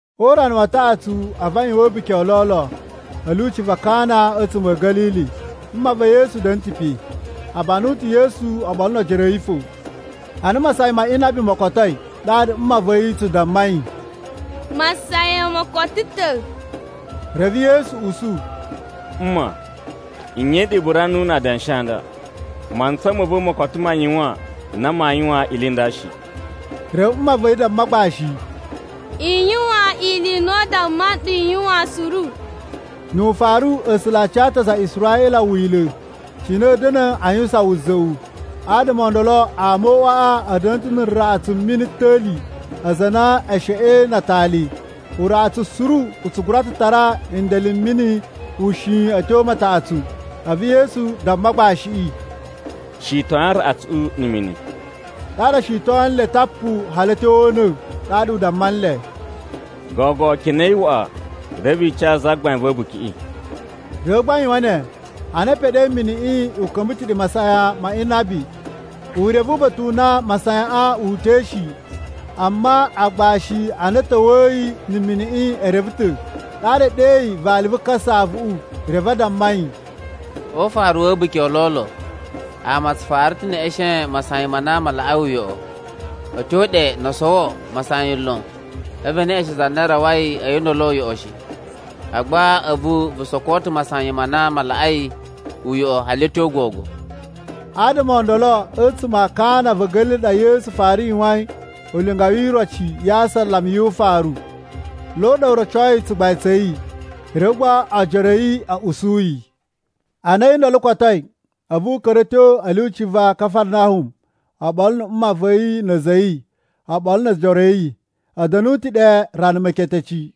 O urana wa taꞌatsu, a̱vu a yuwan a̱buki o lolo a̱ lyuci va Kana a̱tsuma̱ a̱ Ga̱lili. Mma va̱ Yesu da̱na̱ ta̱ pe. A banu ta̱ Yesu oɓolo no ojoro a̱ yi fo. Ana masayan ma inabi mo kotoi, ɗaɗa mma va̱ yi tsu damma yi, “Masayan mo koto ta̱.” Reve Yesu usu, “Mma, nye i ɗa i bura numu na adanshi a nda? Mantsa ma̱ va̱ mo koto ma yuwan na maa yuwan ili i nda shi.” Reve mma va̱ yi damma agbashi, “I yuwan ili i na u damma nɗu i yuwan suru.” Nu ufaru, A̱sula̱ a ca ta̱ aza a Israꞌila wila̱ cine a̱a̱ da̱na̱ a yuwusan wuza̱ꞌu. Adama o ndolo ama o uꞌwaꞌa a̱ da̱na̱ ta̱ na araꞌatsu a̱ mini a̱ ta̱li, aza a na e sheꞌein na atali. Uraꞌatsu suru u tsu gura ta̱ tara ndele m mini ushin a̱ tyo mataꞌatsu. A̱vu Yesu damma agbashiꞌi, “Shitoyin araꞌatsuꞌu na̱ mini.” Ɗaɗa o shitoyin le tapu hali a̱ tyo o una̱. Ɗaɗa u damma nle, “Gogo kenei waꞌa, reve i ca zagbain va̱ a̱bukiꞌi.” Reve gba a yuwan ne. Ana u peɗei, miniꞌi u ka̱mba̱ ta̱ ɗe masayan ma inabi. U reve uba̱ta̱ u na masayaꞌan wu uta̱i shi, amma agbashi a na a̱ ta̱wa̱yi na̱ miniꞌi e reve ta̱. Ɗaɗa u ɗeyi vali vu kasaꞌavuꞌu, reve u damma yi, “O ufaru wa̱ a̱buki o lolo ama a tsu fara ta̱ neꞌeshen masayan ma na ma laꞌai uyoꞌo. A̱ tyo ɗe no o sowo masayan lon, a̱vu e neꞌeshen za na rawai a̱yi ndolo uyoꞌo shi. Agba a̱vu vu soko ta̱ masayan ma na ma laꞌai uyoꞌo hali a̱ tyo gogo.” Adama o ndolo a̱tsuma̱ a Kana va̱ Ga̱lili ɗa Yesu fara yuwain ulinga wi iroci ya asalama yu ufaru. Lo ɗa u rocoi tsugbain tsa̱ yi, reve gba ojoro a̱ yi a̱ usu yi. Ana a̱yi ndolo kotoi, a̱vu u ka̱ra̱ a̱ tyo a̱ lyuci va Kafarnahum oɓolo na̱ mma va̱ yi, na̱ a̱za̱ a̱ yi, oɓolo no ojoro a̱ yi. A̱ da̱nu ta̱ ɗe rana meketeci.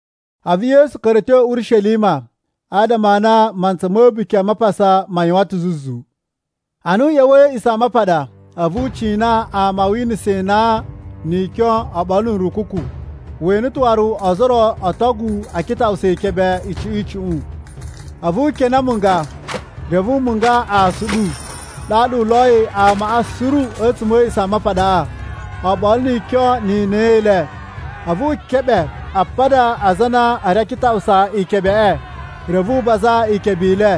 A̱vu Yesu ka̱ra̱ a̱ tyo Urishelima adama a na mantsa ma̱ A̱buki a Mapasa ma yuwan ta̱ zuzu. Ana u ꞌya̱wa̱i a̱ A̱a̱ꞌisamapaɗa, a̱vu u cina ama a winasa inan, ni ikyon, oɓolo na̱ nrukuku. We ene ta̱ waru ozo o ro o otogu a kitaꞌusa ikebe icuꞌun icuꞌun. A̱vu u kene amunga reve u munga aasuɗu. Ɗaɗa u loyi amaꞌa suru a̱tsuma̱ a̱ A̱a̱ꞌisamapaɗaꞌa, oɓolo ni ikyon ni inan i le. A̱vu wu keɓe apada a aza a na a̱ ri a kitaꞌusa ikebeꞌe, reve u baza ikebe i le.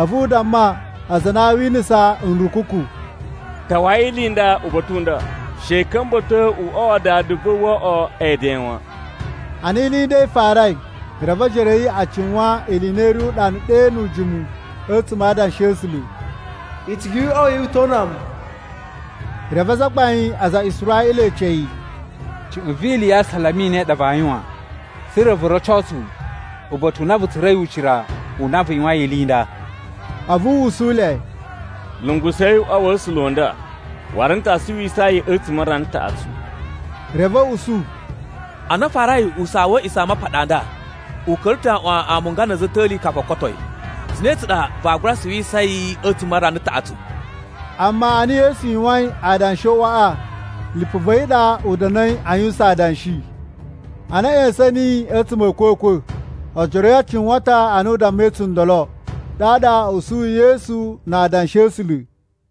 A̱vu u damma aza a na a winasa nrukuku, “Tawai ili i nda uba̱ta̱ u nda! She i ka̱mba̱to uꞌwa wa Dada va̱ wo oꞌwo eden wan.” Ana ili i nda i farai, reve ojoro a̱ yi a cuwan ni ili i na i ri uɗanu ɗe nu ujimu a̱tsuma̱ a Adanshi a̱ A̱sula̱: “Icigi yu uꞌwa ya̱ wu i to una mu.” Reve azagbain a aza a Israꞌila e ece yi, “Cuꞌun vi ili ya asalama i ne i ɗa vaa yuwan, tsa̱ra̱ vu roco tsu uba̱ta̱ u na vu tsura̱i ucira u na vu yuwain ili i nda?” A̱vu u usu le, “Lungusa̱i uꞌwa wa̱ A̱sula̱ u nda, waru n ta suwisa yi a̱tsuma̱ a rana taꞌatsu.” Reve a̱ usu, “Ana a farai usaa wa̱ A̱a̱ꞌisamapaɗa a nda, u ka̱ra̱ ta̱ aꞌwan amunga na̱ a̱za̱ a̱ ta̱li kafu o koto yi. Cine tsa ɗa vaa gura suwisa yi a̱tsuma̱ a rana taꞌatsu?” Amma ana Yesu yuwain adanshi o “uꞌwaꞌa,” lipu va̱ yi ɗa u da̱na̱i a yuwusan adanshi. Ana a̱ ꞌya̱sa̱n niyi a̱tsuma̱ a̱ a̱kwa̱kwa̱, ojoro a̱ yi a cuwan ta̱ ana u dammai tsundolo. Ɗaɗa a̱ usuyi Yesu na Adanshi a̱ A̱sula̱.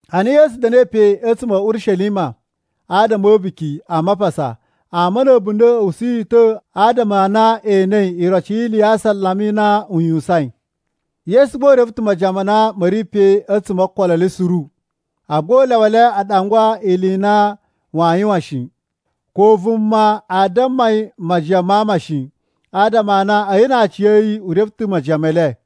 Ana Yesu da̱na̱i pe a̱tsuma̱ a̱ Urishelima adama a̱ A̱buki a Mapasa, ama na̱ a̱bunda̱ a̱ usu yi ta̱ adama a na e enei iroci yi ili ya asalama i na u yuwusain. Yesu gba u reve ta̱ majiyan ma na ma̱ ri pe a̱tsuma̱ o okolo e le suru, agba u lyawa le a ɗangwaa yi ili i na waa yuwan shi. Ko vuma aa damma yi majiyan ma ama shi, adama a na a̱yi na aciya̱yi u reve ta̱ majiyan me le.